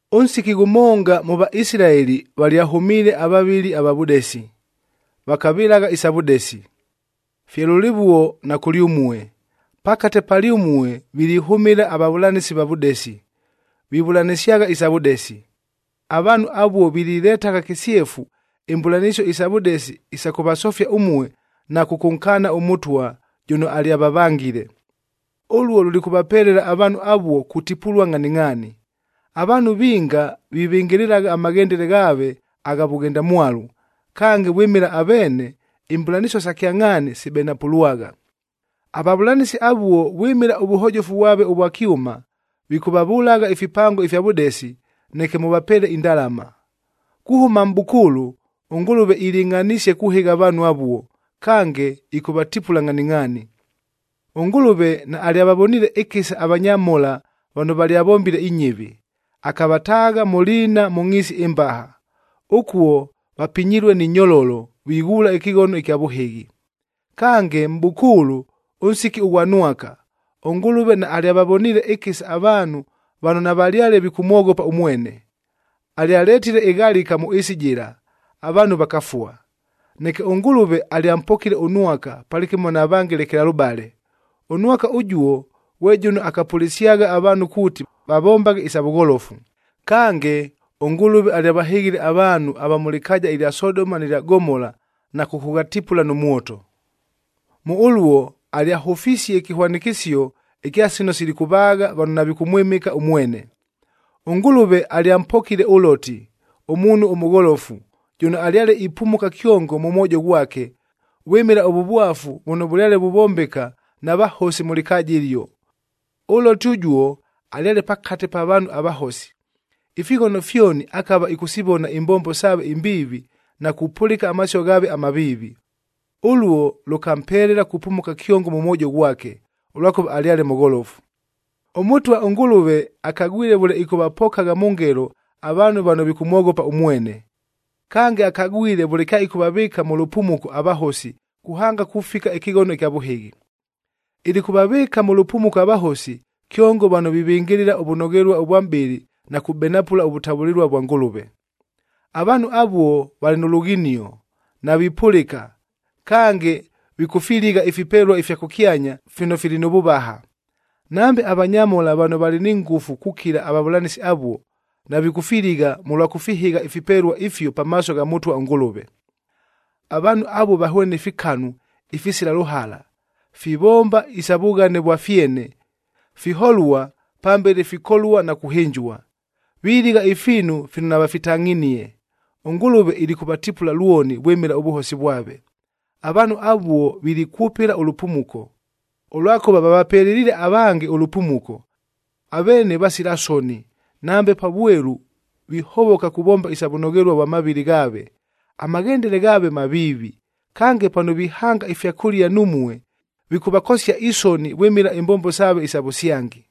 Ʉnsiki ghʉmonga mʉ Vaisilaeli valyahʉmiile avavɨli ava vʉdesi, vakavɨlagha isa vʉdesi. Fye lʉlɨvuo na kʉlyʉmue, pakate palyʉmue vilihʉmɨla avavʉlanɨsi ava vʉdesi, vivʉlanɨsyagha isa vʉdesi. Avaanhu avuo vililetagha kɨsyefu imbʉlanɨsio isa vʉdesi isa kʉvasofia ʉmue na kʉkʉnkaana ʉMʉtwa jʉno alyavavangile. Ʉluo lulikʉvapelela avaanhu avuo kutipulua ngʼhaningʼhaani. Avaanhu vinga vivɨngɨlɨlagha amaghendele ghaave agha vʉghendamwalu, kange vwɨmɨla aveene, imbʉlanɨsio sa kyangʼhaani sibenapʉlwagha. Avavʉlanɨsi avuo vwɨmɨla ʉvʉhojofu vwave ʉvwa kyʉma, vikʉvavʉlagha ifipango ifya vʉdesi, neke mʉvapeele indalama. Kuhʉma mʼbʉkʉʉlʉ ʉNgʉlʉve ilɨngʼhanisie kuhɨgha avaanhu avuo, kange ɨkʉvatipula ngʼhaningʼhaani! ɄNgʉlʉve naalyavavoniile ɨkɨsa avanyamhola vano valyavombile inyɨvi, akavataagha mʉ liina mʉ ngʼhiisi ɨmbaha. Ʉkuo vapinyilue ni nyololo, vighuula ɨkɨghono ɨkya vʉhɨghi. Kange mʼbʉkʉʉlʉ, ʉnsiki ʉghwa Nwaka, ʉNgʉlʉve naalyavavoniile ɨkɨsa avaanhu vano navalyale vikʉmwoghopa ʉmwene. Alyaletile ɨghalika mʉ ɨɨsi jɨla, avaanhu vakafua. Neke ʉNgʉlʉve alyampokile ʉNwaka palɨkɨmo na vange lekelalʉbale. ɄNwaka ʉjuo ghwe jʉno akapʉlɨsyagha avaanhu kuuti vavombaghe isa vʉgholofu. Kange, ʉNgʉlʉve alyavahɨghile avaanhu ava mʉ lɨkaaja ɨlya Sodoma nɨ lya Gomola na kʉkʉghatipula nʉ mwoto. Mʉ ʉluo, alyahʉfisie ɨkɨhwanɨkɨsio ɨkya sino silikʉvaagha vano navikʉmwɨmɨka ʉmwene. ɄNgʉlʉve alyampokile ʉLoti, ʉmuunhu ʉmʉgholofu, jʉno alyale ipumuka kyongo mʉ mwojo ghwake vwɨmɨla ʉvʉvwafu vʉno vʉlyale vuvombeka na vahosi mʉ lɨkaaja ɨlio. ɄLoti ʉjuo, alyale pakate pa vaanhu avahosi, ifighono fyoni akava ɨkʉsivona imbombo saave imbiivi na kupʉlɨka amasio ghaave amaviivi. Ʉluo, lʉkampelela kupumuka kyongo mʉ mwojo ghwake, ʉlwakʉva alyale mʉgholofu. ɄMʉtwa ʉNgʉlʉve akagwile vʉle ɨkʉvapokagha mʉ ngelo avaanhu vano vikʉmwoghopa ʉmwene. Kange, akagwile vʉle kyaɨkʉvavɨɨka mʉ lʉpumuko avahosi, kuhanga kufika ɨkɨghono ɨkya vʉhɨghi. Ilikʉvavɨɨka mʉ lʉpumuko avahosi, kyongo vano vivɨngɨlɨla ʉvʉnoghelua ʉvwa mʼbɨlɨ na kubenapʉla ʉvʉtavʉlɨlua vwa Ngʉlʉve. Avaanhu avuo valɨ nʉ lughinio, navipʉlɨka, kange vikʉfiligha ifipelua ifya kʉkyanya fino fili nʉ vʉvaha. Nambe avanyamhola vano valɨ ni ngʉfu kukila avavʉlanɨsi avuo, navikʉfiligha mʉlwa kʉfihɨgha ifipelua ifio pamaaso gha Mʉtwa ʉNgʉlʉve. Avaanhu avuo vahwene fikanu, ifisila lʉhala, fivomba isa vughane vwa fyene, fiholua pambele fikolua na kuhɨnjua! Viligha ifiinu fino navafitangʼhinie. ɄNgʉlʉve ilikʉvatipulua lwoni vwɨmɨla ʉvʉhosi vwave. Avaanhu avuo vilikwʉpɨla ʉlʉpumuko, ʉlwakʉva vavapeleliile avange ʉlʉpumuko. Aveene vasila soni, nambe pa vwelu vihovoka kuvomba isa vʉnoghelua vwa mavɨlɨ ghaave, amaghendele ghaave maviivi, kange pano vihanga ifyakʉlia numue, vikʉvakosia isoni vwɨmɨla imbombo saave isa vʉsyangi.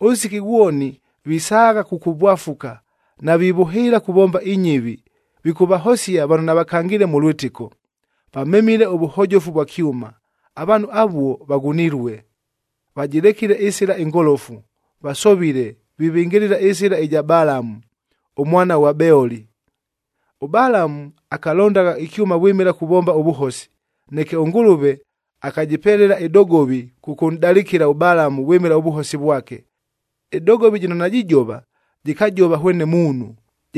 Ʉnsiki ghwoni, visaagha kukuvwafuka, navivʉhɨɨla kuvomba inyɨvi, vikʉvahosia vano navakangiile mʉ lwɨtɨko. Vamemile ʉvʉhojofu vwa kyʉma. Avaanhu avuo vaghunilue! Vajɨlekile ɨsɨla ɨngolofu, vasovile, vivɨngɨlɨla ɨsɨla ɨja Balamu, ʉmwana ghwa Beoli. ɄBalamu akalondagha ɨkyʉma vwɨmɨla kuvomba ʉvʉhosi. Neke ʉNgʉlʉve akajɨpelela ɨdogovi kʉkʉnʼdalɨkɨla ʉBalamu vwɨmɨla ʉvʉhosi vwake. Ɨdogovi jɨno najijova, jɨkajova hwene muunhu,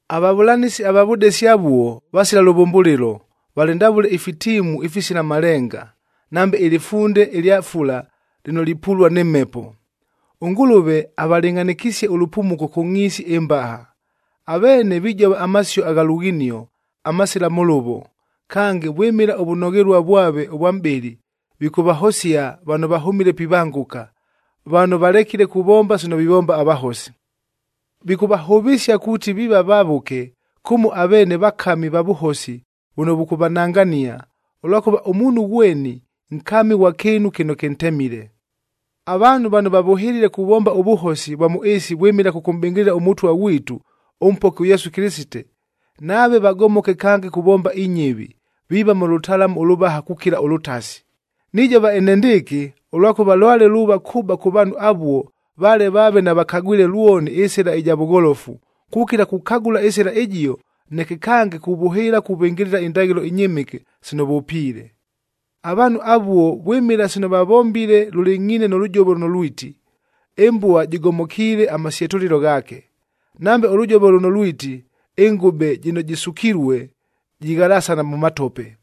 Avavʉlanɨsi ava vʉdesi avuo, vasila lʉvʉmbʉlɨlo, valɨ ndavʉle ifitiimu ifisila malenga, nambe ɨlɨfunde ɨlya fula lɨno lipulua nɨ mhepo. ɄNgʉlʉve avalɨngʼhanɨkisie ʉlʉpumuko kʉ ngʼhiisi ɨmbaha. Aveene vijova amasio agha lughinio, amasila mʉlʉvo, kange vwɨmɨla ʉvʉnoghelua vwave ʉvwa mʼbɨlɨ vikʉvahosia vano vahʉmile pivangʉka, vano valekile kuvomba sino vivomba avahosi. Vikʉvahʉvɨsia kuuti viiva vavʉke, kʉmo aveene vakami va vʉhosi vʉno vʉkʉvanangania, ʉlwakʉva ʉmuunhu ghweni, nkami ghwa kɨɨnu kɨno kɨntemile. Avaanhu vano vavʉhɨlile kuvomba ʉvʉhosi vwa mʉ ɨɨsi vwɨmɨla kʉkʉmʼbɨngɨlɨla ʉMʉtwa ghwitu, ʉMpoki ʉYesu Kɨlɨsite, nave vagomoke kange kuvomba inyɨvi, viiva mʉ lʉtalamu ʉlʉvaha kukila ʉlʉtasi. Nijova enendɨɨkɨ, ʉlwakʉva lwale luuva kʉba kʉ vaanhu avuo, vale vaave navakagwile lwoni ɨsɨla ɨja vʉgholofu, kukila kukagʉla ɨsɨla ɨjio, neke kange kuvʉhɨɨla kuvɨngɨlɨla indaghɨlo inyɨmɨke sino vʉpiile. Avaanhu avuo vwɨmɨla sino vavombile lʉlɨngʼhiine nʉ lʉjovo lʉno lwiti, “Ɨmbua jɨgomokiile amasyetʉlɨlo ghaake,” nambe ʉlʉjovo lʉno lwiti, “Ɨngʉbe jɨno jɨsukilue, jighalasana mʉ matope!”